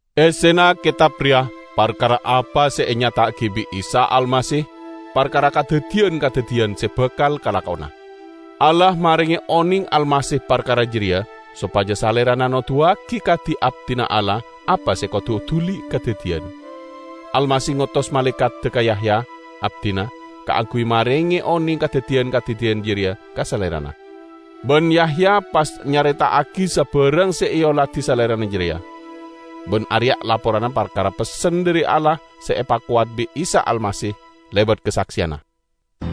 Essena ketab reya parkara apa se enyata'agi bi' Isa Almasih parkara kadaddiyan-kadaddiyan se bakal kalakona. Allah marenge oneng Almasih parkara jareya sopaja Salerana noduwagi ka di-abdina Allah apa se kodu duli kadaddiyan. Almasih ngotos malaekadda ka Yahya, abdina, kaangguy marenge oneng kadaddiyan-kadaddiyan jareya ka salerana. Ban Yahya pas nyareta'agi sabarang se eoladi salerana jareya; ban areya' laporanna parkara pessen dhari Allah se epakowat bi' Isa Almasih lebat kasakseyanna.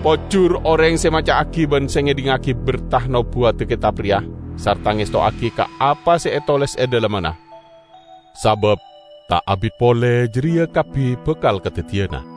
Pojur oreng se maca'agi ban se ngedhingngagi berta nobuwadda ketab reya sarta ngestowagi ka apa se etoles e dhalemmanna. Sabab ta' abit pole jareya kabbi bakal kadaddiyana.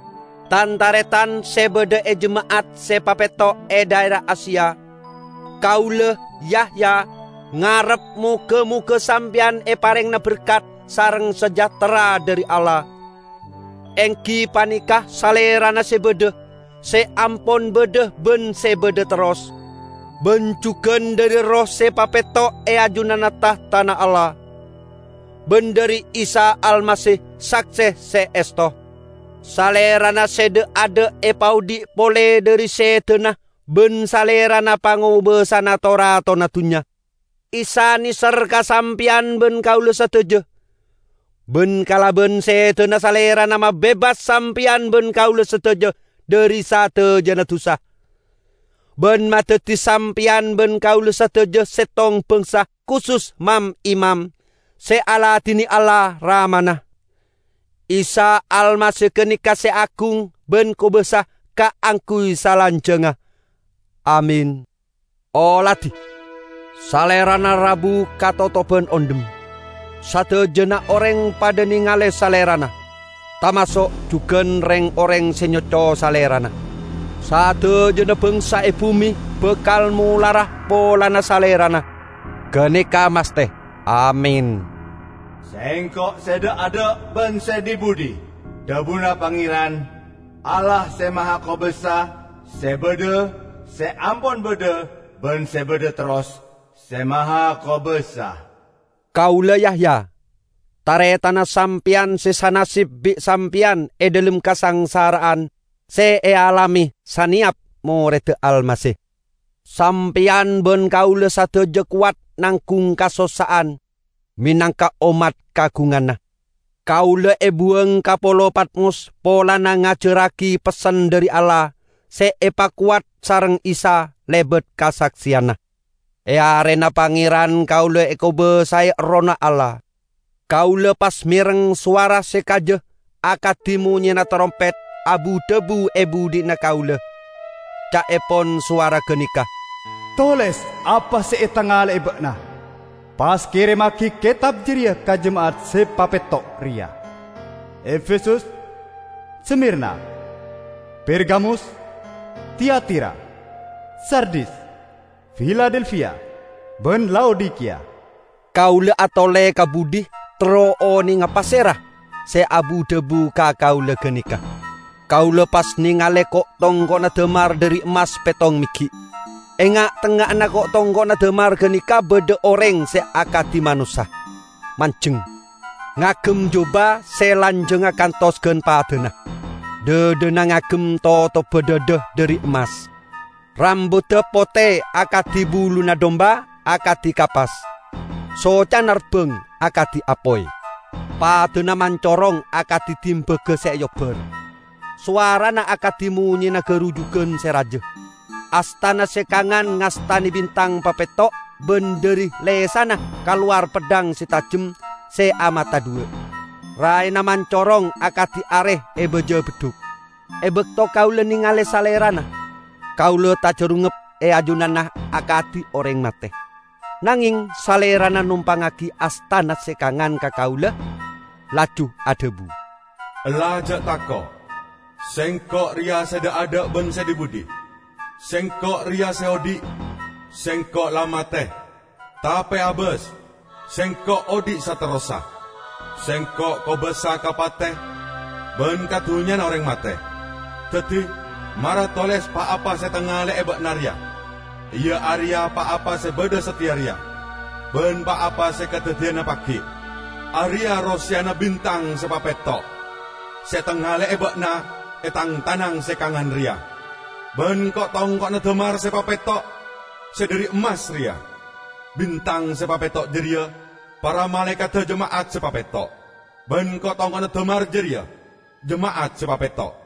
Tan-taretan se badha e jema'at se papetto' e dhaera Asia! Kaula, Yahya, ngarep moga-moga sampeyan eparengngana berkat sareng sejahtera dhari Allah -- enggi paneka Salerana se badha, se ampon badha ban se badha terros -- ban jugan dhari erroh se papetto' e ajunanna tahtana Allah, ban dhari Isa Almasih, sakse se esto. Salerana se dha'-adha' epaodhi' pole dhari sedana ban Salerana pangobasana to-ratona dunnya. Isa neser ka sampeyan ban kaula sadaja, ban kalaban sedana Salerana mabebas sampeyan ban kaula sadaja dhari sadajana dusa, ban madaddi sampeyan ban kaula sadaja settong bangsa kusus mam-imam, se aladine Allah, Ramana. Isa Almasih ganeka se agung ban kobasa kaangguy salanjangnga. Amin! Oladi! Salerana rabu katotoban ondhem! Sadajana oreng padha nengale Salerana, tamaso' jugan reng-oreng se nyoco Salerana. Sadajana bangsa e bume bakal molara polana Salerana. Ganeka masthe! Amin! "Sengko' se dha'-adha' ban se dhi-budhi," dhabuna Pangeran, Allah Se Mahakobasa, se badha, se ampon badha, ban se badha terros, Se Mahakobasa. Kaula Yahya, taretanna sampeyan se sanasib bi' sampeyan e dhalem kasangsara'an se ealame saneyap moredda Almasih. Sampeyan ban kaula sadaja kowat nanggung kasossa'an menangka ommat kaagunganna. Kaula ebuwang ka polo Patmos polana ngajarragi pessen dhari Allah se epakowat sareng Isa lebat kasakseyanna. E arena Pangeran kaula ekobasae Errohna Allah; kaula pas mereng sowara se kaja -- akadi monyena tarompet -- abu-dhabu e budhina kaula. Ca'epon sowara ganeka, "Toles apa se etangale'e ba'na, pas keremmagi ketab jareya ka jema'at se papetto' reya: Efesus, Smirna, Pergamus, Tiatira, Sardis, Filadelfia, ban Laodikiya." Kaula atole ka budhi terro onenga pasera se abu-dhabu ka kaula ganeka. Kaula pas nengale ko'-tongko'na damar dhari emmas pettong meggi'. E nga'-tengnga'anna ko'-tongko'na damar ganeka badha oreng se akadi manossa, manjeng. Ngagem juba se lanjangnga kantos gan padana. Dhadhana ngagem totobba dhadha dhari emmas. Rambudda pote akadi buluna dumba, akadi kapas. Socana rabbang akadi apoy; padana mancorong akadi dimbaga se eobbar. Sowarana akadi monyena garujugan se raja. Astana se kangan ngastane bintang papetto', ban dhari lesanna kalowar peddhang se tajem se amata dhuwa'. Raena mancorong akadi are e baja beddhuk. E bakto kaula nengale Salerana, kaula tajarungngep e ajunanna akadi oreng mate. Nangeng Salerana nompangngagi astana se kangan ka kaula, laju adhabu, "Ella, ja' tako'. Sengko' reya se dha'-adha' ban se dhi-budhi. Sengko' reya se odhi'! Sengko' la mate, tape abas, Sengko' odhi' saterrossa. Sengko' kobasa ka pate ban ka dunnyana oreng mate. Daddi, mara toles pa-apa se etangale'e ba'na reya, iya areya pa-apa se badha sateya reya, ban pa-apa se kadaddiyana pagi'. Areya' roseyana bintang se papetto' se etangale'e ba'na e Tang tanang se kangan reya, ban ko'-tongko'na damar se papetto' se dhari emmas reya: Bintang se papetto' jareya para malaekadda jema'at se papetto', ban ko'-tongko'na damar jareya jema'at se papetto'."